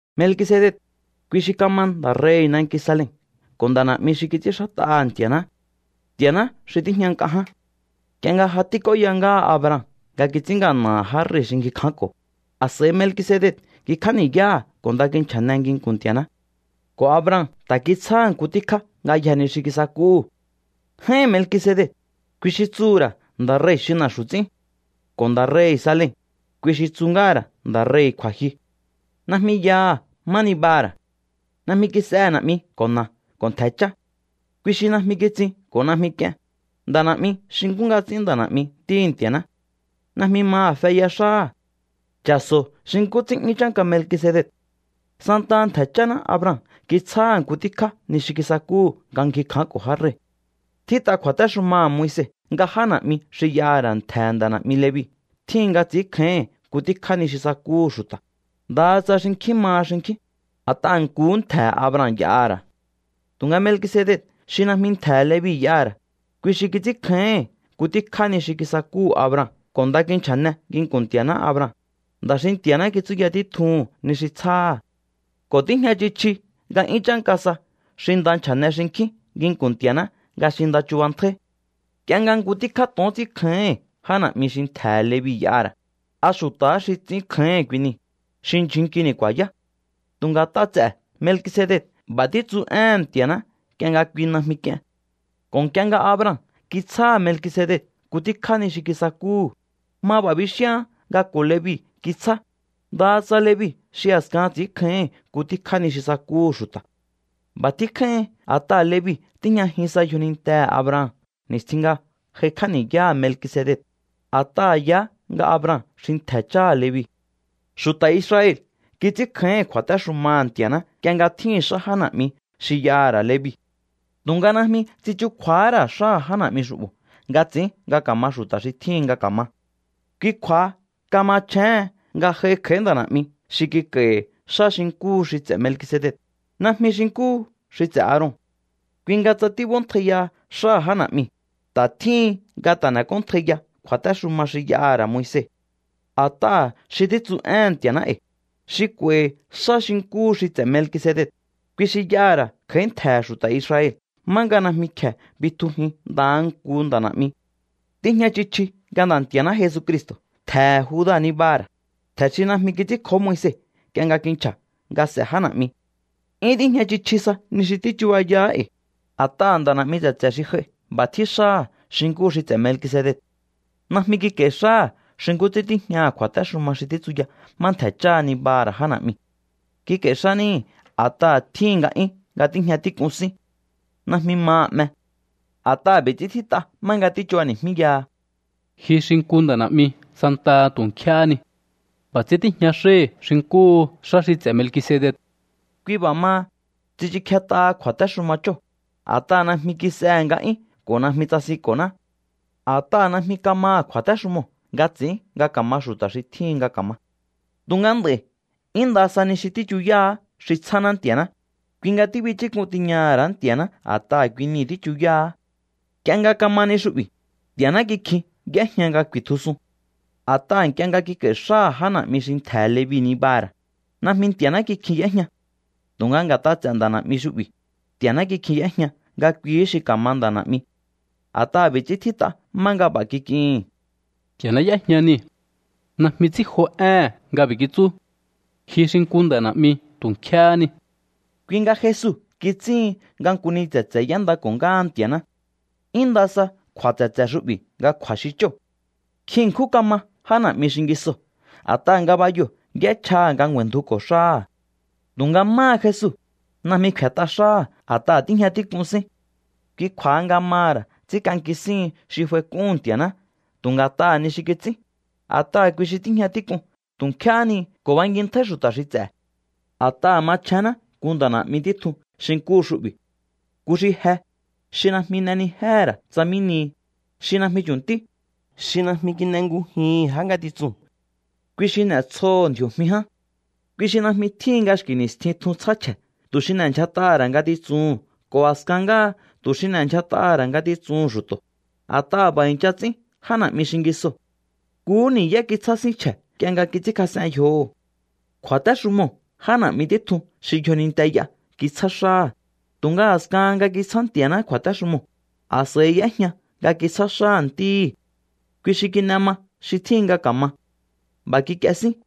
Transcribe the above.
Melkisedec, kui xi kama nda̱ rei̱hi̱ nanki Salem ko̱ nda̱ na̱'mi xi kits'ínxát'aha̱ Nti̱a̱ná, Nti̱a̱ná xi tíjña nk'a ján. Nk'ie nga ja tík'óya ngáha Abraham nga kits'ín ngana̱ha̱ já rei̱ xi ngji kjánko̱, a̱s'a̱i Melkisedec ngjikj'á ni̱yáha̱ ko̱ nda kinchja̱ne nginku̱n Nti̱a̱ná. Ko̱ Abraham ta̱ kitsjáha̱ nku tíkjá ngayjee̱ ni xi kisakúhu̱. J'áín Melkisedec, kui xi tsuhu̱ ra̱ “nda̱ rei̱ xi na̱xu̱ ts'ín”. Ko̱ nda̱ rei̱hi̱ Salem, kui xi tsu ngáha̱ ra̱ “nda̱ rei̱hi̱ kju̱a̱jyu”. Najmi yaha̱ má nibaha̱ ra̱. Najmi kis'ehe̱ na̱'mi ko̱ na̱a ko̱ ntje̱ chá. Kui xi najmi kitsin ko̱ najmi k'ien, nda̱ na̱'mi xi nkú nga ts'ín nda̱ na̱'mi Ntíhi̱ Nti̱a̱ná. Najmi maha̱ feya xáha̱. Cha̱so̱o xi nkú ts'ín 'yún chánka Melkisedec. Santaha ntje̱ cháná Abraham kitsjáha̱ nku tíkjá ni xi kisakúhu̱ nga ngji kjánko̱ já rei̱. Tjít'a kju̱a̱téxumaha̱ Moise nga já na̱'mi xi y'aha̱ ra̱ ntje̱he̱ nda̱ na̱'mi Levi tjíhin nga ts'i̱ínkjáíhi̱n nku tíkjá ni xi sakúhu̱ xu̱ta̱, ndaha tsa xinkjín maha xinkjín, a̱t'aha̱ nkuhú ntje̱he̱ Abraham y'aha̱ ra̱. Tu̱nga Melkisedec xi najmi ntje̱he̱ Levi y'aha̱ ra̱, kui xi kits'ínkjáíhi̱n nku tíkjá ni xi kisakúhu̱ Abraham ko̱ nda kinchja̱ne nginku̱n Nti̱a̱ná Abraham, nda̱ xi Nti̱a̱ná kitsúya títjuhu̱n ni xi tsjáha̱. Ko̱ tíjña chji chji nga 'yún chánka sa xi nda nchja̱ne xinkjín nginku̱n Nti̱a̱ná nga xi nda chubantjáí. Nk'ie nga nku tíkjá to̱on ts'ínkjáíhi̱n já na̱'mi xi ntje̱he̱ Levi y'aha̱ ra̱, a̱ xu̱ta̱há xi ts'ínkjáíhi̱n kui niu̱, xi ndyjun nkini̱ ku̱a̱yá. Tu̱nga nga̱t'a ts'e̱ Melkisedec b'a̱ títsu éhe̱n Nti̱a̱ná nk'ie nga kui najmi k'ien. Ko̱ nk'ie nga Abraham kitsjáha̱ Melkisedec nku tíkjá ni xi kisakúhu̱, ma b'a̱ bixíaán nga ko̱ Levi kítsjá, ndaha tsa Levi xi a̱skahan ts'i̱ínkjáíhi̱n nku tíkjá ni xi sakúhu̱ xu̱ta̱. B'a̱ tjín kjáíhin a̱t'aha̱ Levi tíjñajin sa yjonintehe̱ Abraham ni̱stjin nga j'aikj'á ni̱yáha̱ Melkisedec, a̱t'aha̱ yaá nga Abraham xi ntje̱ cháha̱ Levi. Xu̱ta̱ Israel kits'ínkjáíhi̱n kju̱a̱téxumaha̱ Nti̱a̱ná nk'ie nga tjíhi̱n xá já na̱'mi xi y'aha̱ ra̱ Levi. Tu̱nga najmi tsichukju̱a̱há ra̱ xáha̱ já na̱'mi xu'bo̱ nga ts'ín nga ka̱ma xu̱ta̱ xi tjíhin nga ka̱ma. Kui kju̱a̱ha kamachjéhen nga j'aihi kj'a̱í nda̱ na̱'mi xi kik'a̱i̱hi̱ xá xi nkúhu xi ts'e̱ Melkisedec, najmi xi nkúhu xi ts'e̱ Aaron. Kui nga tsa tíb'óntjaiya xáha̱ já na̱'miu̱, ta̱ tjíhin nga ta̱ n'ek'óntjaiya kju̱a̱téxuma xi y'aha̱ ra̱ Moise. A̱t'aha̱ xi títsu éhe̱n Nti̱a̱ná e̱i̱, xi k'u̱a̱i̱hi̱ xá xi nkúhu xi ts'e̱ Melkisedec, kui xi y'aha̱ ra̱ kj'a̱í ntje̱he̱ xu̱ta̱ Israel má nga najmi kje̱e bitjujin ndaha nku nda̱ na̱'mi. Tíjña chji chji nga Nda̱ Nti̱a̱ná Jesucristo̱ ntje̱he̱ Juda nibaha̱ ra̱, ntje̱ xi najmi kits'ínkjó Moise nk'ie nga kinchja̱ nga s'e̱ já na̱'mi. 'Yún tíjña chji chji sa ni xi tíchubayaá e̱i̱. A̱t'aha̱ nda̱ na̱'mi tse̱tse̱ xi j'ai b'a̱ tjín xáha̱ xi nkúhu xi ts'e̱ Melkisedec. Najmi kik'a̱i̱ xáha̱ xi nkú ts'ín tíjña kju̱a̱téxuma xi títsuya má ntje̱ cháha ni̱baha̱ ra̱ já na̱'miu̱. Kik'a̱i̱ xá níhi̱ a̱t'aha̱ tjíhi̱n nga'yún nga tíjña tík'un sín. Najmi maha̱ 'me. A̱t'aha̱ b'i̱ ts'ín tjít'a má nga tíchubani̱jmíyaha: Ji xi nku nda̱ na̱'mi santaha tu̱ nkjéhé ni. B'a̱ ts'ín tíjña xáhi̱ xi nkúhu xá xi ts'e̱ Melkisedec. Kui b'a̱ maha, tsichukjet'aha kju̱a̱téxuma chóo̱, a̱t'aha̱ najmi kis'ehe̱ nga'yún ko̱ najmi tsasinko̱ná. A̱t'aha̱ najmi kamaha̱ kju̱a̱téxumoo̱ nga ts'i̱ín nga ka̱ma xu̱ta̱ xi tjíhin nga ka̱ma. Tu̱nga nd'a̱i̱ 'yún nda sa ni xi tíchuyáá xi tsjáná Nti̱a̱ná, kui nga tíbichúk'un tiñaha̱ ra̱á Nti̱a̱ná a̱t'aha̱ kui nii̱ tíchuyáá. Nk'ie nga kama ni xu'bi̱, Nti̱a̱ná kikjihín y'éjña nga ku̱i̱tjusun. A̱t'aha̱ nk'ie nga kik'a̱i̱ xáha̱ já na̱'mi xi ntje̱he̱ Levi nibaha̱ ra̱, najmi Nti̱a̱ná kikjin y'éjña. Tu̱nga nga̱t'a ts'e̱ nda̱ na̱'mi xu'bi̱, Nti̱a̱ná kikjihín y'éjña nga kuihí xi ka̱ma nda̱ na̱'mi. A̱t'aha̱ b'i̱ ts'ín tjít'a má nga b'a̱ kik'ihi̱n: Nti̱a̱ná y'ejña nii̱. Najmi ts'i̱ínjo éhe̱n nga b'i̱ kitsú: “Ji xi nku nda̱ na̱'mi tu̱ nkjéhé ni.” Kui nga Jesu kits'íhin nga nku ni tse̱tse̱ y'éndako̱ ngáha Nti̱a̱ná. 'Yún nda sa kju̱a̱ tse̱tse̱ xu'bi̱ nga kju̱a̱ xi chóo̱. Nkjin ṉkjún kama já na̱'mi xingisoo̱ a̱t'aha̱ ngabayoo̱ y'échjaha̱ nga ngju̱a̱i̱ndjuko̱ xáha̱. Tu̱nga máha Jesu, najmi kfe̱t'a xáha̱ a̱t'aha̱ tíjña tík'un sín. Kui kju̱a̱ha nga maha̱ ra̱ ts'ínk'anki síhin xi f'aik'úhu̱n Nti̱a̱ná tu̱ nga̱t'aha̱ ni xi kits'ín, a̱t'aha̱ kui xi tíjña tík'un tu̱ nkjéhé ni ko̱ bankintjáí xu̱ta̱ xi ts'e̱. A̱t'aha̱ machjénná nku nda̱ na̱'mi títjun xi nkúhu xu'bi̱, nku xi je, xi najmi n'enijéhe̱ ra̱ tsa mí nihi, xi najmi chu̱ntí, xi najmi kin'engujihi̱n já ngatitsuu̱n. Kui xi n'etsjoho̱ ndji̱o̱jmi ján. Kui xi najmi tjíhin nga xki̱ ni̱stjin tjun tsjá chje̱ tu̱ xi n'e̱ndyjat'aha̱ ra̱ ngatitsuhu̱n ko̱ a̱skan ngáha tu̱ xi n'e̱ndyjat'aha̱ ra̱ ngatitsuhu̱n xu̱to̱, a̱t'aha̱ b'a̱ i̱ncha ts'ín já na̱'mi xingisoo̱. Nkuhú ni̱yá kitsjá sín chje̱ nk'ie nga kits'ínkjas'en yjoho̱. Kju̱a̱téxumoo̱ já na̱'mi títjun xi yjoninte y'a kitsjá xáha̱, tu̱nga a̱skahan nga kitsjá Nti̱a̱ná kju̱a̱téxumoo̱, a̱s'a̱i y'éjña nga kitsjá xáha̱ Ntíhi̱. Kui xi kin'e ma xi tjíhin nga ka̱ma. B'a̱ kik'ie sín.